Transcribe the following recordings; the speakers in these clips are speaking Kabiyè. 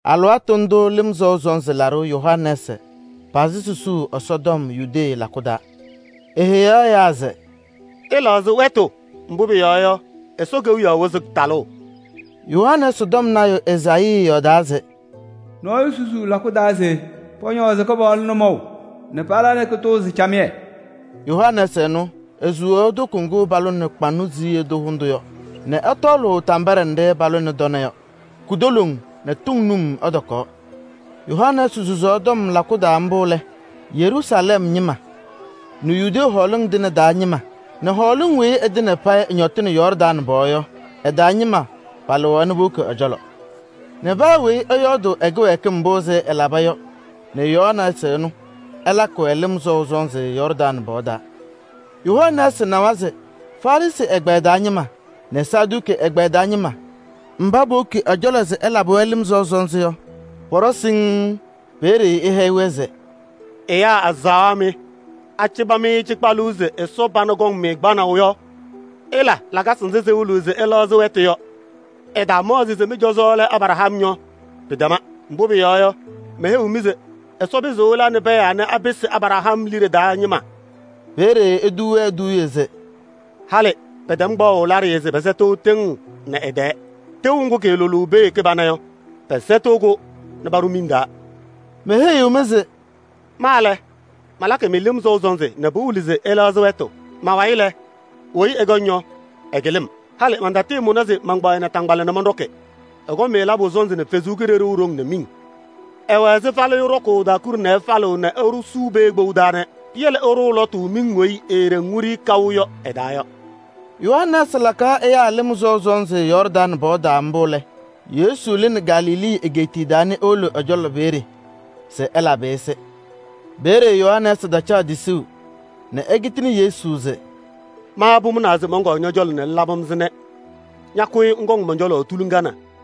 Alɩwaatʋ ndʋʋ Lɩm Sɔʋ Sɔnzɩ Laɖʋ Yohanɛɛsɩ pazɩ susuu Ɛsɔtɔm Yudee lakʋ taa. Eheyaɣ ɛyaa se: “Ɩlɛɣzɩ wɛtʋ, mbʋ pʋyɔɔ yɔ, Ɛsɔ Kewiyaɣ wɩzɩ talʋʋ.” Yohanɛɛsɩ tɔm lɔɔyaɣ tʋ Ezaayii yɔɔdaa se: “Nɔɔyʋ susuu lakʋ taa se pɔñɔɔzɩ Kɩpaɣlʋ nʋmɔʋ nɛ pala nɛ kʋtʋʋzɩ camɩyɛ.” Yohanɛɛsɩ ɛnʋ, esuwaɣ toko ŋgʋ palʋnɩ kʋyʋndʋʋ kpaŋnɔ hʋndʋ yɔ nɛ ɛtɔɔlʋʋ tambaɖɛ nɖɩ palabɩnɩ tɔnɛ yɔ. Kutoloŋ nɛ tʋŋ num ɛtɔkaɣ. Yohanɛɛsɩ susaɣ lakʋ taa mbʋ lɛ, Yeruusalɛm ñɩma nɛ Yudee hɔɔlɩŋ tɩŋa taa ñɩma nɛ hɔɔlɩŋ weyi ɩtɩŋa payɩ ɩñɔtɩnɩ Yɔɔrdaŋ pɔɔ yɔ ɩ-taa ñɩma palɩɣ powoki ɛ-cɔlɔ nɛ paa weyi ɛyɔɔdʋʋ ɛ-kɩwɛɛkɩm mbʋ ɛlaba yɔ nɛ Yohanɛɛsɩ ɛnʋ ɛlakɩ-wɛ lɩm sɔʋ sɔnzɩ Yɔɔrdaŋ pɔɔ taa. Yohanɛɛsɩ nawa se Farɩsɩ ɛgbɛyɛ taa ñɩma nɛ Saduki ɛgbɛyɛ taa ñɩma mba powoki ɛ-cɔlɔ se ɛlabɩ-wɛ lɩm sɔʋ sɔnzɩ yɔ, pɔɖɔwa siŋŋ. Peeye eheyi-wɛ se: “Ɖʋmaa mɩ! Aheyi-mɩ se ise Ɛsɔ pana wena akɔŋ-mɩ kpanaʋ yɔ? Ɩla lakasɩ nzɩ sɩwɩlɩɣ se ɩlɛɣzɩ wɛtʋ yɔ. Ɩtaamaɣzɩ se mɩ-cɔzɔ lɛ Abraham yɔ, pɩtɛma. Mbʋ pʋyɔɔ yɔ, meheyiɣ-mɩ se Ɛsɔ pɩzɩɣ ɛla nɛ pɛɛ anɛ apɩsɩ Abraham liɖe taa ñɩma.” Peeye etuu-wɛ eduuye se: “Halɩ pɛtɛm kpaɣʋ laɖɩyɛ se pɛsɛtɩɣ tɩŋ nɛ ɩ-tɛɛ: tɩʋ ŋgʋ kɩɩlʋlʋʋ pee kɩbana yɔ, pɛsɛtɩɣ-kʋ nɛ paɖʋ miŋ taa.” Meheyiɣ-mɩ se: “Ma lɛ, malakɩ-mɩ lɩm sɔʋ sɔnzɩ nɛ pɩwɩlɩ se ɩlɛɣzɩ wɛtʋ. Ma-wayɩ lɛ, weyi ɛkɔŋ yɔ, ɛkɩlɩ-m. Halɩ mantatɩɩmʋna se mankpaɣ ɛ-naataŋgbala nɛ mɔnɖɔkɩ. Ɛkɔŋ-mɩ labʋ sɔnzɩ nɛ Ɛsɔ Kalɩzaɣ haʋ nɛ miŋ. Ɛwɛ ɛzɩ falɩyʋ ɖɔkʋʋ ɖaakuɖe nɛ ɛfalɩɣ nɛ esuu pee kpou taa nɛ piyele ɛɖʋʋ lɔtʋ miŋ weyi eeɖeŋ wiɖiyi kaʋ yɔ ɛ-taa yɔ.” Yohanɛɛsɩ lakaɣ ɛyaa lɩm sɔʋ sɔnzɩ Yɔɔrdaŋ pɔɔ taa mbʋ lɛ, Yesu lɩnɩ Galilee egeetiye taa nɛ ewolo ɛ-cɔlɔ peeye se ɛlabɩ-ɩ-sɩ. Peeye Yohanɛɛsɩ tacaɣ tisuu nɛ ekitini Yesu se: “Ma pʋmʋnaa se mɔnkɔɔ ñɔ-cɔlɔ nɛ ŋlabɩ-m-sɩ nɛ ña ñakʋyɩ ŋkɔŋ mɔn-cɔlɔ tuliŋa na!”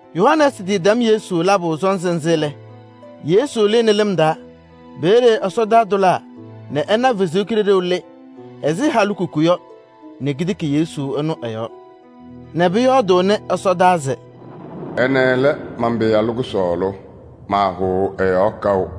Yohanɛɛsɩ tɩtɛm Yesu labʋ sɔnzɩ nzɩ lɛ, Yesu lɩɣnɩ lɩm taa. Peeye ɛsɔtɔnʋʋ tʋlaa nɛ ɛna Ɛsɔ Kalɩzaɣ lɩ ɛsɔdaa ɛzɩ halikuku yɔ nɛ ketiki Yesu ɛnʋ ɛ-yɔɔ nɛ pʋyɔɔdʋʋnɩ ɛsɔdaa se: “Ɛnɛ lɛ man-Pɩyalʋ kʋsɔɔlʋ, maahʋʋ ɛ-yɔɔ kaʋ.”